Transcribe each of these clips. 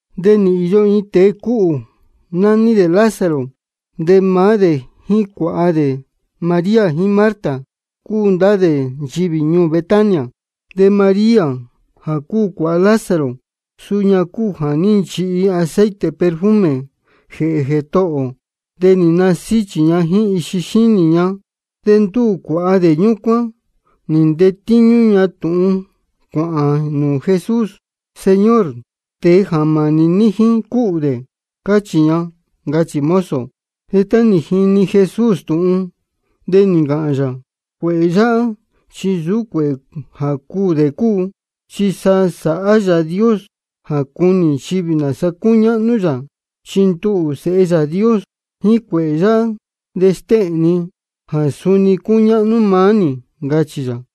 De nī īyo iin tēe cúhū, nání dē Lázaro. De maá dē jíín cuāha dē María jíín Marta, cúu ndá dē nchivī ñuū Betania. De María jā cúu cuāha Lázaro, suu ña cúu jā ní nchihi aceite perfume jēhē Jētohō ō, de nī nasíchī ña jíín ixi xínī ña. De ndúū cuāha dē ñúcuán nī ntetíñú ña tūhun cuāhān nūū Jesús: Señor, tēe jā mānī ní jíín, cúhū dē, cáchī ña, ncachī mozo. De tá nī jini Jesús tūhun, de nī ncāhān yā: Cuēhē yáhá chi nsūú cuēhē jā cuū dē cúu. Chi sa sāhá Yāā Dios jā cunī nchivī nāsa cúñáhnú yā. Chi nduhū, Sēhe Yāā Dios, jíín cuēhē yáhá de stéhēn ni jā suni cúñáhnú maá nī, ncachī yā.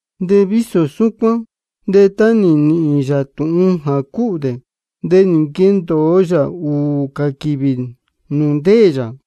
De vísō súcuán de tá nī nīhīn yā tūhun jā cúhū dē, de nī nquendōo yā ūū cā quīvī nūū ndéē yā.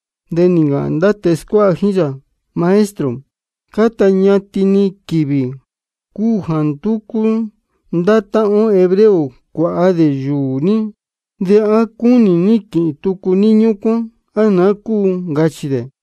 De nī ncāhān ndá tēe scuáha jíín yā: Maestro, cáta ñatin-ni quīvī cúu jā ndúcú ndá táhán ó hebreo cuāha dē yūū ní. ¿De á cúnī ní quīhīn tucu ní ñúcuán, á naá cúu? ncachī dē.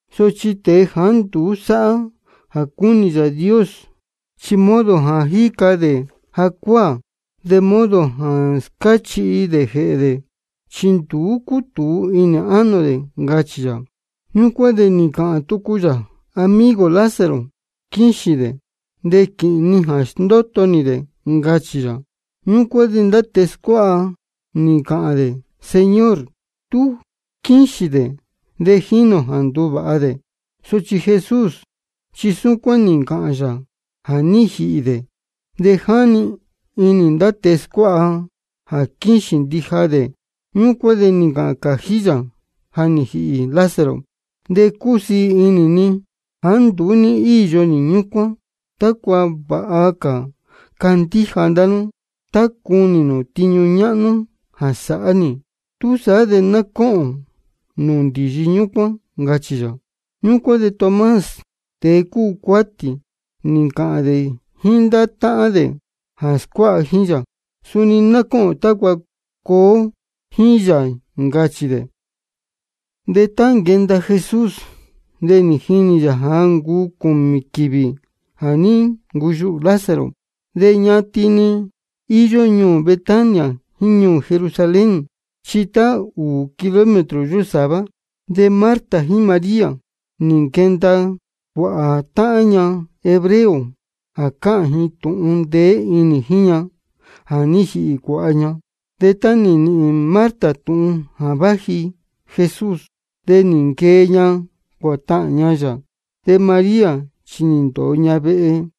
Sochi tēe jāá nduú sáhá jā cúnī Yāā Dios, chi modo jā jíca dē jacuáā, de modo jā scáchihi dē jēhē dē, chi nduú cútūu inī ánō dē, ncachī yā. Ñúcuán de nī ncāhān tucu yā: Amigo ō Lázaro quíxīn dē, de quīhīn ni jā sndóto nī dē, ncachī yā. Ñúcuán de ndá tēe scuáha nī ncāhān dē: Señor, tú quíxīn dē de jínī ō jā nduvāha dē. Sochi Jesús chi súcuán nī ncāhān yā jā ní jīhī dē. De jáni inī ndá tēe scuáha jā quíxīn ndija dē. Ñúcuán de nī ncāhān cājí yā: Ja nī jīhī Lázaro. De cúsiī inī ni jāá nduú ní íyo nī ñúcuán, tácua vāha cā candíja ndá nú tá cunī nū tiñu ñáhnú jā sāhá nī. Túsaá de ná cóhōn nūū ndīyi ñúcuán, ncachī yā. Ñúcuán de Tomás, tēe cúu cuátī, nī ncāhān dē jíín ndá táhán dē jā scuáha jíín yā: Suni ná cóhōn tácua cuū ō jíín yā, ncachī dē. De tá nī nquenda Jesús, de jínī yā ja nī ncuu cūmī quīvī jā ní ncuyuhū Lázaro. De ñatin-ni íyó ñuū Betania jíín ñuū Jerusalén, chi tá ūū kilómetro yósāvá. De Marta jíín María, nī nquenda cuāhā táhán ña hebreo jā cáhān ji tūhun ndeé inī jíín ña jā ní jīhī cuāha ña. De tá nī nīhīn Marta tūhun jā váji Jesús, de nī nquee ña cuātahān ña yā. De María chi nī ndōo ña vehe.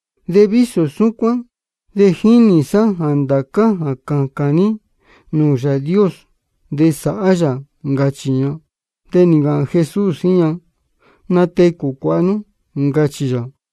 De vísō súcuán de jínī sá jā ndācá jā cācān ní nūū Yāā Dios, de sāhá yā, ncachī ña. De nī ncāhān Jesús jíín ña: Natecū cuāha nú, ncachī yā.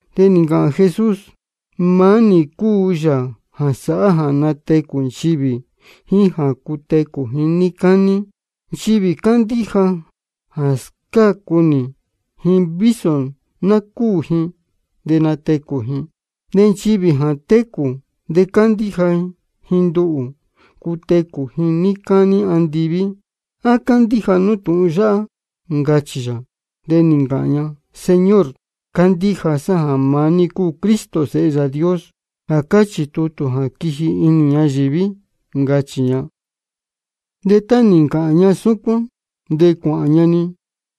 De nī ncāhān Jesús: Maá nī cúu Yāā jā sáhá jā natecū nchivī jíín jā cutecū ji níí cání. Nchivī cándíja jā scácu nī ji, vísō ná cúū ji, de natecū ji. De nchivī jā técū de candíja ji nduhū, cutecū ji níí cání andiví. ¿A cándíja nú tūhun yáhá? ncachī yā. De nī ncāhān ña: Señor, cándíja sá jā maá ní cúu Cristo Sēhe Yāā Dios, jā cáchī tutū jā quiji inī ñayīví, ncachī ña. De tá nī ncāhān ña súcuán, de cuāhān ña-ni,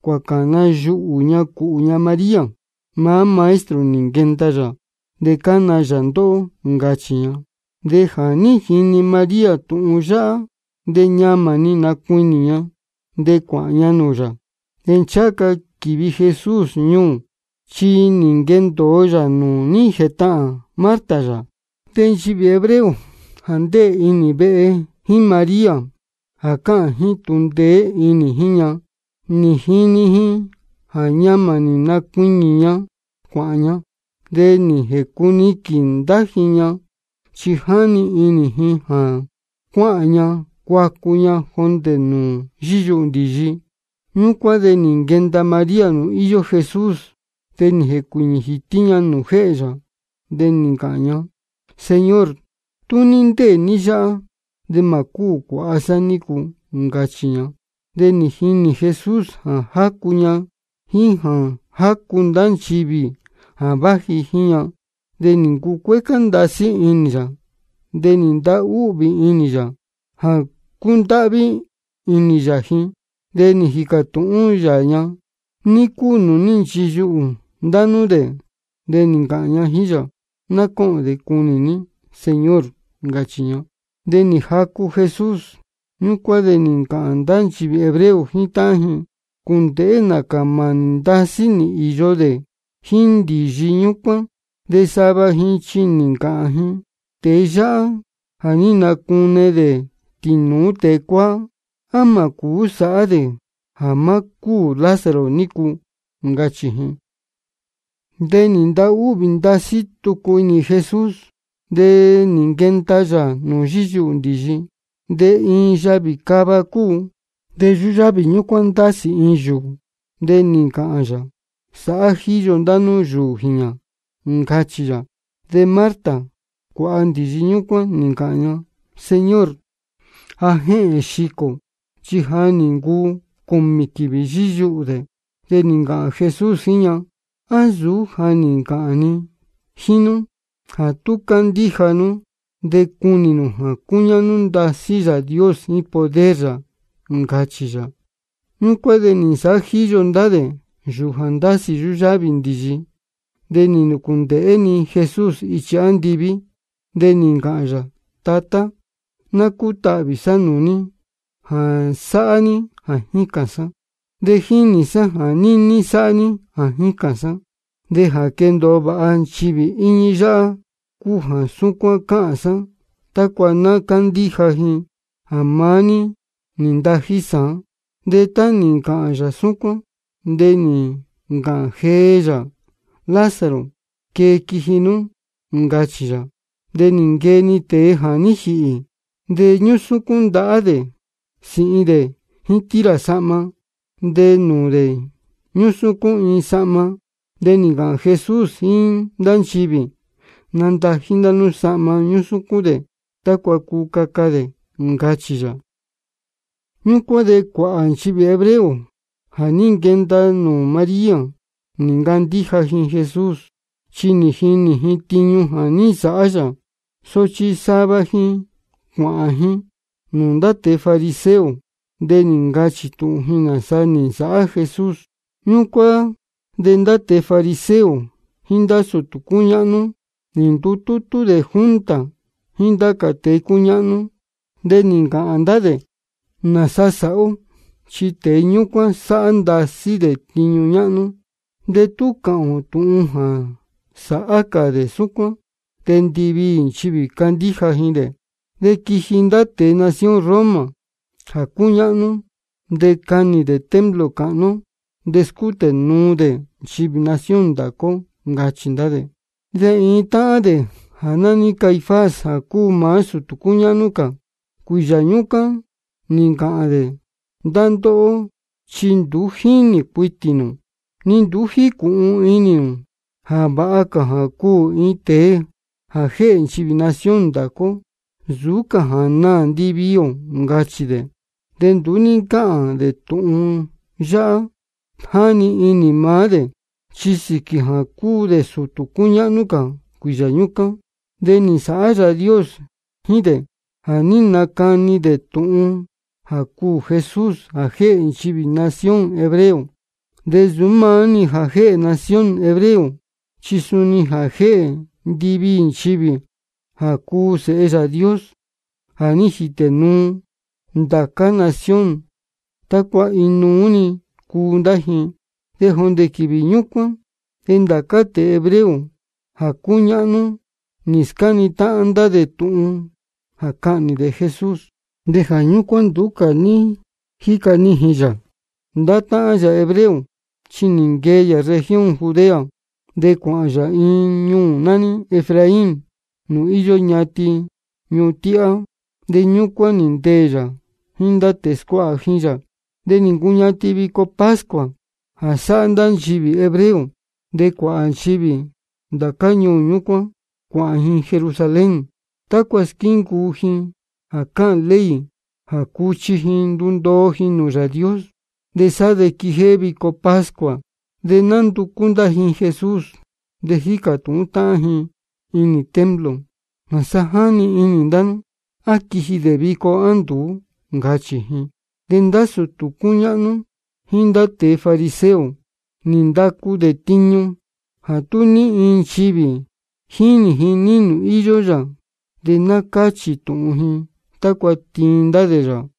cuācana yuhū ña cūhū ña María: Maá Maestro nī nquenda yā, de cána yā ndóhó, ncachī ña. De jā ní jini María tūhun yáhá, de ñamā nī nacuiñī ña, de cuāhān ña nūū yā. De ncháha ca quīvi Jesús ñuū, chi nī nquendōo yā nūū ní jētahān Marta yā. De nchivī hebreo jā ndéē inī vehe jíín María jā cáhān ji tūhun ndeé inī jíín ña, nī jinī ji jā ñamā nī nacuiñī ña cuāhān ña. De nī jēcuniquīn ndá ji ña, chi jáni inī ji jā cuáhān ña cuacu ña jondē nūū yíyuhū ndīyi. Ñúcuán de nī nquenda María nūū íyó Jesús, de nī jēcuīñī jītí ña nūū jéhē yā, de nī ncāhān ña: Señor, tú ní ndéē ní yáhá, de mā cúū cuāha sá nícu, ncachī ña. De nī jinī Jesús jā jácu ña jíín jā jácu ndá nchivī jā váji jíín ña. De nī ncucuécá ndasí inī yā, de nī ntahúhvī inī yā jā cúndáhví inī yā ji. De nī jīcā tūhún yā ña: ¿Ní cúu nūū ní nchiyuhū ndá nú dē? De nī ncāhān ña jíín yā: Ná cóhōn de cunī ní, Señor, ncachī ña. De nī jacu Jesús. Ñúcuán de nī ncāhān ndá nchivī hebreo jíín táhán ji: Cūndēhé nācā mānī ndasí nī īyo dē jíín ndīyi ñúcuán. De sava ji chi nī ncāhān ji: Tēe yáhá jā ní nacune dē tīnūú tēe cuáá, ¿á mā cūú sāhá dē jā má cúū Lázaro nícu? ncachī ji. De nī ntahúhvī ndasí tucu inī Jesús, de nī nquenda yā nūū yíyuhū ndīyi. De iin yavī cava cúu, de yúyávī ñúcuán ndásī iin yūū. De nī ncāhān yā: Sāhá jíyo ndá nú yūū jīñā, ncachī yā. De Marta, cuāha ndīyi ñúcuán, nī ncāhān ña: Señor, ja jéhēn xicō dē, chi ja nī ncuu cūmī quīvī yíyuhū dē. De nī ncāhān Jesús jíín ña: ¿A nsūú ja nī ncāhān ni jíín nú jā tú candíja nú de cunī nū jā cúñáhnú ndasí Yāā Dios jíín poder yā? ncachī yā. Ñúcuán de nī nsāhá jíyo ndá dē yūū jā ndásī yúyávī ndīyi. De nī nūcūndēhé-ni Jesús ichi andiví, de nī ncāhān yā: Tatá, ná cútahvī sá nūū ní jā sáhá ní jā jícān sá. De jínī sá jā níní sáhá ní jā jícān sá. De jā quendōo vāha nchivī íñí yáhá cúu jā súcuán cáhān sá, tácua ná cándíja ji jā maá ní nī ntají sāán. De tá nī ncāhān yā súcuán, de nī ncāhān jee yā: Lázaro, quee quiji nú, ncachī yā. De nī nquee-ni tēe jā ní jīhī, de ñúsúcún ndahá dē sīhin dē jíín tira sahma. De nūū dē ñúsúcún iin sahma. De nī ncāhān Jesús jíín ndá nchivī: Nandají ndá nú sahma ñúsúcún dē, tácua cuu caca dē, ncachī yā. Ñúcuán de cuāhā nchivī hebreo jā ní nquenda nūū María, nī ncandíja ji Jesús, chi nī jinī ji tiñu jā ní nsāhá yā. Sochi sava ji cuāhān ji nūū ndá tēe fariseo, de nī ncachī tūhun ji nāsa nī nsāhá Jesús. Ñúcuán de ndá tēe fariseo jíín ndá sūtū cúñáhnú nī ndutútú dē junta jíín ndá cā tēe cúñáhnú. De nī ncāhān ndá dē: ¿Nāsa sāhá ó? Chi tēe ñúcuán sáhá ndasí dē tiñu ñáhnú. De tú cuāha ó tūhun jā sāhá cā dē súcuán, de ndiviī nchivī candíja ji dē. De quiji ndá tēe nación Roma jā cúñáhnú, de canī dē templo cāhnú ó, de scútē nuu dē nchivī nación ndācá ó, ncachī ndá dē. De iin táhán dē jā nání Caifás, jā cúu maá sūtū cúñáhnú cā cuīyā ñúcuán, nī ncāhān dē: Ndá ndóhó chi nduú jínī cuitī nū, ni nduú jícūhun inī nū jā vāha cā jā cuū iin tēe jā jéhē nchivī nación ndācá ó nsūú cā jā naā ndiviī ō, ncachī dē. De nduú ní ncáhān dē tūhun yáhá jā jáni inī maá dē. Chi sīquī jā cúu dē sūtū cúñáhnú cā cuīyā ñúcuán, de nī nsāhá Yāā Dios jíín dē jā ní nacani dē tūhun jā cuū Jesús jā jéhē nchivī nación hebreo. De nsūú maá-ni jā jéhē nación hebreo, chi suni jā jéhē ndiviī nchivī jā cúu sēhe Yāā Dios jā ní jītē nuu ndācá nación, tácua inuú-ni cuu ndá ji. De jondē quīvī ñúcuán de ndācá tēe hebreo jā cúñáhnú, nī scáni táhán ndá dē tūhun jā cahnī dē Jesús. De jā ñúcuán nduú cā ní jíca nijīn yā nūū ndá táhán yā hebreo, chi nī nquee yā región Judea, de cuāhān yā iin ñuū nání Efraín, nūū íyó ñatin ñuhun tíhá. De ñúcuán nī ndeē yā jíín ndá tēe scuáha jíín yā. De nī ncuñatin vico pascua jā násāhá ndá nchivī hebreo. De cuāhā nchivī ndācá ñuū ñúcuán cuāhān ji Jerusalén, tácua squíncuu ji jā cáhān ley jā cuchi ji ndundoo ji nūū Yāā Dios, de sá de quijéhé vico pascua. De nánducú ndá ji Jesús, de jícā tūhún táhán ji inī templo: ¿Nāsa jáni inī ndá nú? ¿A quiji dē vico, á nduú? ncachī ji. De ndá sūtū cúñáhnú jíín ndá tēe fariseo nī ndacu dē tiñu jā tú ní iin nchivī jínī ji ní nūū íyó yā, de ná cáchī tūhun ji, tácua tiin ndá dē yā.